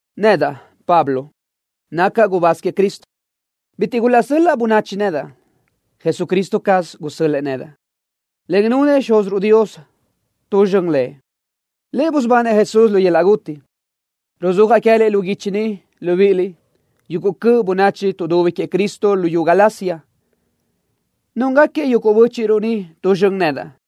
Nedaʼ, Pablo, nacaʼ gubáz queëʼ Cristo. Bitiʼ gulaʼsöl-laʼ bönachi nedaʼ. Jesucristo caz gusö́l-lëʼë nedaʼ, en nunëʼ Xúziruʼ Dios tu zxön Lëʼ. Lëʼ busubanëʼ Jesús lu yöl-laʼ guti. Ruzúajaʼ queë́liʼ lu guichi ni, libíʼiliʼ, yuguʼ cöʼ bönachi tuʼdubi queëʼ Cristo luyú Galacia. Núngaquiëʼ yuguʼ bö́chiʼruʼ ni tu zxön nedaʼ.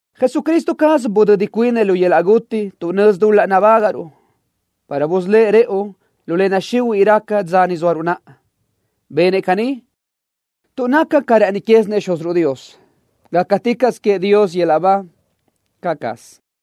Jesucristo caz budödi cuinëʼ lu yöl-laʼ guti tuʼ nözi dul-laʼ nabágaʼruʼ para busölë́ʼ rëʼu lu le naxihuiʼ raca dza ni zóaruʼ naʼa. Benëʼ caní tuʼ naca ca rë́ʼëni quézinëʼ Xúziruʼ Dios. ¡Gácaticaʼsö queëʼ Dios yöl-laʼ ba! ¡Caʼ caz!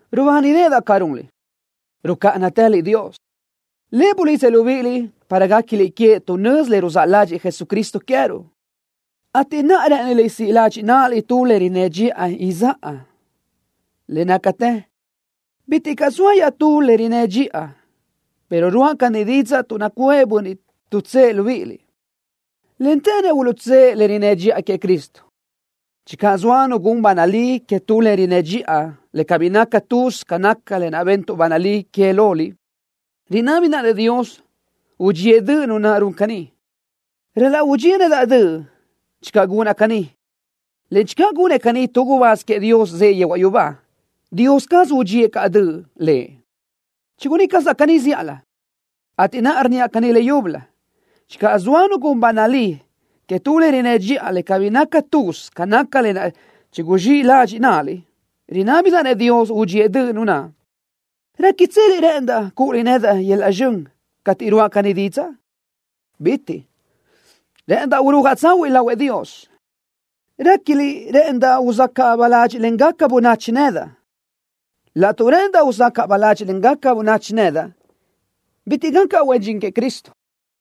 Rubánideʼedaʼ ca runliʼ, rucáʼanatëliʼ Dios. Lëʼ bulidzëʼ libíʼiliʼ para guéquiliʼ queëʼ tuʼ nözi le ruzáʼ ládxëʼë Jesucristo queë́ruʼ, ateʼ naʼa rë́ʼëniliʼ siʼ ladxiʼ náʼaliʼ tu le rinnë́ dxiʼa izáʼa. Le nácatë bitiʼ caʼ zoa iaʼtú le rinnë́ dxiʼa pero ruáʼa caní didzaʼ tuʼ nacuʼë bönniʼ tuʼtsë́ʼë libíʼiliʼ, en të́ʼënëʼ uluʼtsë́ʼë le rinnë́ dxiʼa queëʼ Cristo. Channö zoa nu gun ba nalí que tu le rinnë́ dxiʼa le cabí naca tuz ca naca lë naʼ bentuʼ ba nalí que loliʼ libíʼiliʼ, rinábidaʼ-nëʼ Dios udxíëʼ döʼ nu naʼ run caní. Ral-laʼ udxíëʼ nedaʼ döʼ channö gunaʼ caní, en channö gunëʼ caní tu gubáz queëʼ Dios zëʼë yehuaʼ yubá, Dios caz udxíëʼ caʼ lëʼ döʼ. Chigunná cazaʼ caní zíʼalö, ateʼ naʼa rnníaʼ caní leyúbölö: Channö zoa nu gun ba nalí que tu le rinnë́ dxiʼa le cabí naca tuz ca naca lë naʼ chiguzxíʼ ladxiʼ náʼaliʼ, rinábidaʼ-nëʼ Dios udxíëʼ döʼ nu naʼ. ¿Réquitseliʼ rë́ʼëndaʼ cúʼuliʼ nedaʼ yöl-laʼ zxön cateʼ ruʼa caní didzaʼ? ¡Bitiʼ caʼ! Rë́ʼëndaʼ urúajaʼ tsahuiʼ lahuëʼ Dios. ¿Réquiliʼ rë́ʼëndaʼ uzacaʼ baládxiʼlengaca bönachi nedaʼ? Laʼtuʼ rë́ʼëndaʼ uzacaʼ baládxiʼlengaca bönachi nedaʼ, bitiʼ gacaʼ huen dxin queëʼ Cristo.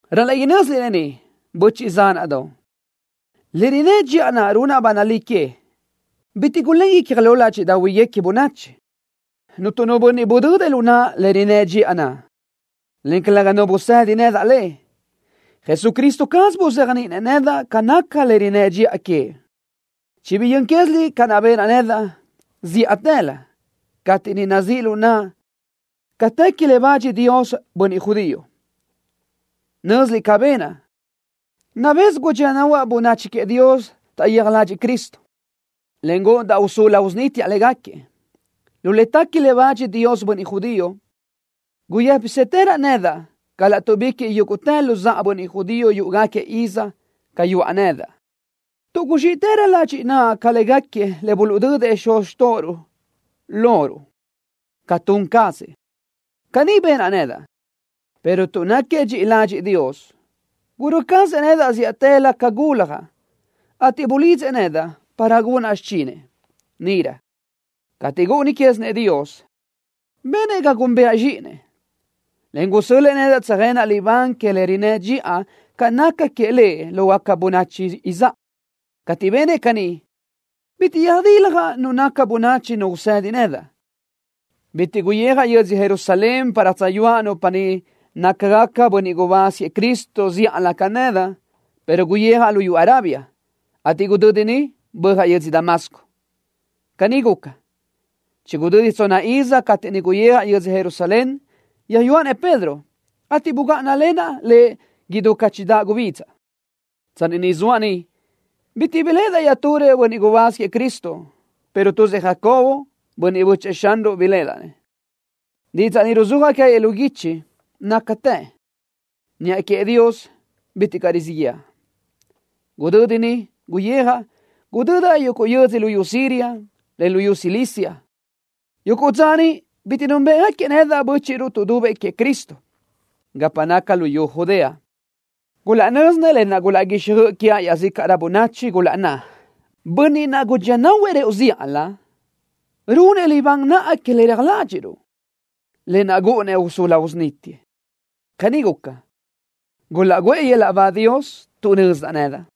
Ral-laʼ inö́ziliʼ lë ni, böchiʼ zánaʼdoʼ. Le rinnë́ dxiʼa naʼ runaʼ ba nalí que bitiʼ gulén icja lo ládxiʼdaʼahuiguequi bönachi. Cuntu nu bönniʼ budödëʼ lu naʼa le rinnë́ dxiʼa naʼ, en calëga nu bönniʼ busédinëʼ nedaʼ le. Jesucristo caz buzéajniʼinëʼ nedaʼ ca naca le rinnë́ dxiʼa queëʼ. Chibiyö́n quéziliʼ ca naʼ ben cazaʼ nedaʼ zíʼatëlö cateʼ niʼ nazíʼ lu naʼa ca tequi le bach Dios bönniʼ judío. Nö́ziliʼ ca benaʼ, yenniʼ gudxía nahuaʼ bönachi queëʼ Dios taʼyija ladxiʼ Cristo, en gúʼundaʼ usulu usunítiaʼ léguequi. Lu le tequi le bach Dios bönniʼ judío, guyë́pisëtëraʼ nedaʼ ca láʼtuʼbiquiʼ yúguʼtë luzáʼa bönniʼ judío yúʼugaquiëʼ iz ca yuʼa nedaʼ, tuʼ guzxiʼrö ladxiʼ naʼa ca léguequi le buluʼdödëʼ xuz xtóʼoruʼ loruʼ ca tun cazëʼ. Caní benaʼ nedaʼ, pero tuʼ náquiëʼ dxiʼi ladxiʼ Dios, gurö́ cazëʼ nedaʼ zíʼatëlö ca guljaʼ, ateʼ bulidzëʼ nedaʼ para gunaʼ xichinëʼ. Níʼirö, cateʼ gúʼuni quézinëʼ Dios, benëʼ ga núnbëʼa-nëʼ zxíʼinëʼ, en gusö́l-lëʼë nedaʼ tsöjenaʼ libán que le rinnë́ dxiʼa ca naca queëʼ Lëʼ lógaca bönachi izáʼa. Cateʼ benëʼ caní, bitiʼ yödiljaʼ nu naca bönachi nu usedi nedaʼ. Cabí guyijaʼ yödzö Jerusalén para tsöyúaʼ nupa niʼ nácagaca bönniʼ gubáz queëʼ Cristo zíʼalö ca nedaʼ, pero guyijaʼ luyú Arabia, ateʼ gudödi niʼ böjaʼ yödzö Damasco. Caní guca, chigudödi tsonna iz cateʼ niʼ guyijaʼ yödzö Jerusalén, yöyúaʼ-nëʼ Pedro, ateʼ bugáʼanalenaʼ lëʼ idú ca chidáʼ gubidza. Tsanni niʼ zoaʼ niʼ bitiʼ caʼ biléʼedaʼ iaʼturëʼ bönniʼ gubáz queëʼ Cristo, pero tuzëʼ Jacobo, bönniʼ bö́chëʼë Xanruʼ biléʼedaʼ. Didzaʼ ni ruzúajaʼ queë́liʼ lu guichi nácatë. Niʼa queëʼ Dios bitiʼ caʼ rizíʼ yëʼa. Gudödi niʼ guyijaʼ, gudödaʼ yuguʼ yödz luyú Siria, en luyú Cilicia. Yuguʼ dza niʼ bitiʼ núnbëʼgaquiëʼ nedaʼ bö́chiʼruʼ tuʼdubëʼ queëʼ Cristo gapa naca luyú Judea. Gulaʼnö́zisinëʼ lë naʼ gúlaʼguixjöʼ quiaʼ iaʼzícaʼrö bönachi, gulaʼnná: “Bönniʼ naʼ gudxía nahuëʼ rëʼu zíʼalö, runëʼ libán naʼa que le reja ládxiʼruʼ, lë naʼ gúʼunëʼ usulu usunítiëʼ.” Caní guca, gulaʼguʼë yöl-laʼ ba Dios tuʼ nözdaʼ nedaʼ.